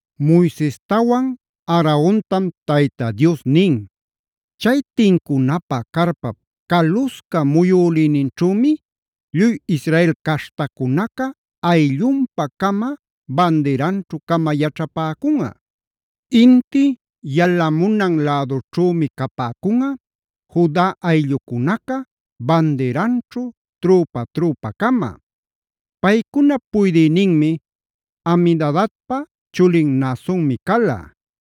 Moisestawan Aarontam Tayta Dios nin: “Chay tincunapä carpap calusca muyülïninćhümi lluy Israel caśhtacunaca ayllunpa-cama bandiranćhu-cama yaćhapäcunꞌa. “Inti yalamunan lädućhümi capäcunꞌa, Juda ayllucunaca bandiranćhu trüpa-trüpa-cama. Paycunap puydïnin Aminadabpa chulin Naasonmi cala.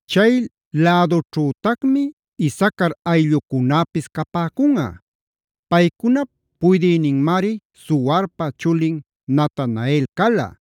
Chay lädunćhütacmi Isacar ayllucunäpis capäcunꞌa. Paycunap puydïninmari Zuarpa chulin Natanael cala.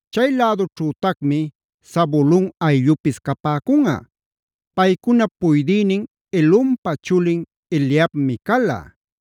Chay lädućhütacmi Zabulon ayllupis capäcunꞌa. Paycunap puydïnin Helonpa chulin Eliabmi cala.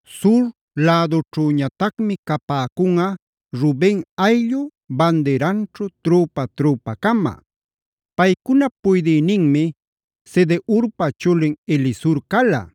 “Sur lädućhüñatacmi capäcunꞌa, Ruben ayllu bandiranćhu trüpa-trüpa-cama. Paycunap puydïninmi Sedeurpa chulin Elisur cala.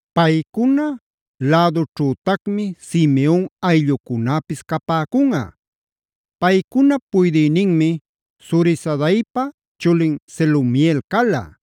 Paycuna lädućhütacmi Simeon ayllucunäpis capäcunꞌa. Paycunap puydïninmi Zurisadaipa chulin Selumiel cala.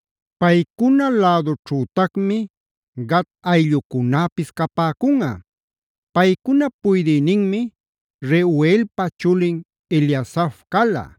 Paycuna lädućhütacmi Gad ayllucunäpis capäcunꞌa. Paycunap puydïninmi Reuelpa chulin Eliasaf cala.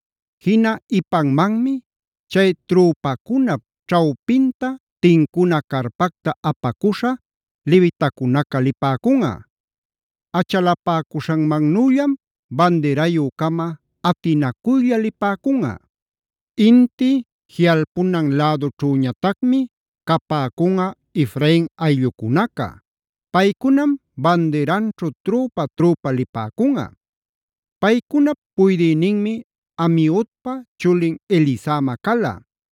“Jina ipanmanmi chay trüpacunap ćhawpinta tincuna carpacta apacuśha levitacunaca lipäcunꞌa. Achalapäcuśhanmannüllama bandirayü-cama atinacuylla lipäcunꞌa. “Inti jiꞌalpunan lädućhüñatacmi capäcunꞌa, Efrain ayllucunämi bandiranćhu trüpa-trüpa lipäcunꞌa. Paycunap puydïninmi Amiudpa chulin Elisama cala.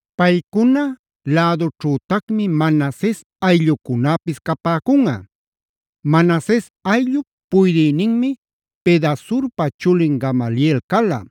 Paycuna lädućhütacmi Manases ayllucunäpis capäcunꞌa. Manases ayllup puydïninmi Pedasurpa chulin Gamaliel cala.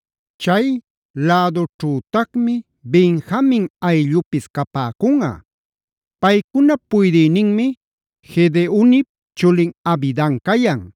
Chay lädućhütacmi Benjamin ayllupis capäcunꞌa. Paycunap puydïninmi Gedeonip chulin Abidan cayan.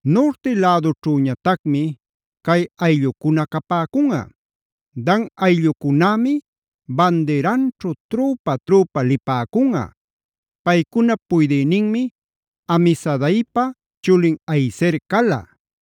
“Nurti lädućhüñatacmi cay ayllucuna capäcunꞌa, Dan ayllucunämi bandiranćhu trüpa-trüpa lipäcunꞌa. Paycunap puydïninmi Amisadaipa chulin Ahiezer cala.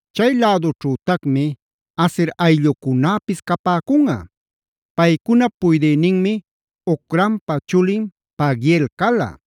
Chay lädućhütacmi Aser ayllucunäpis capäcunꞌa. Paycunap puydïninmi Ocranpa chulin Pagiel cala.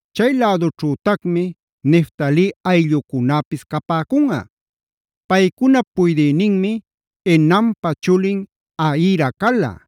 Chay lädućhütacmi Neftali ayllucunäpis capäcunꞌa. Paycunap puydïninmi Enanpa chulin Ahira cala.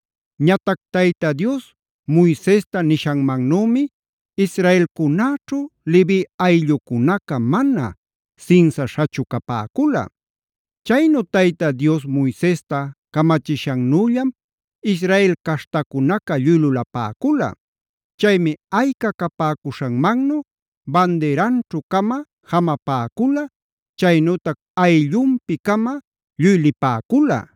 Ñatac Tayta Dios Moisesta nishanmannümi israelcunäćhu Levi ayllucunaca mana sinsaśhachu capäcula. Chaynu Tayta Dios Moisesta camachishannüllam Israel caśhtacunaca lluy lulapäcula. Chaymi ayca capäcuśhanmannu bandiranćhu-cama jamapäcula, chaynütac ayllunpi-cama lluy lipäcula.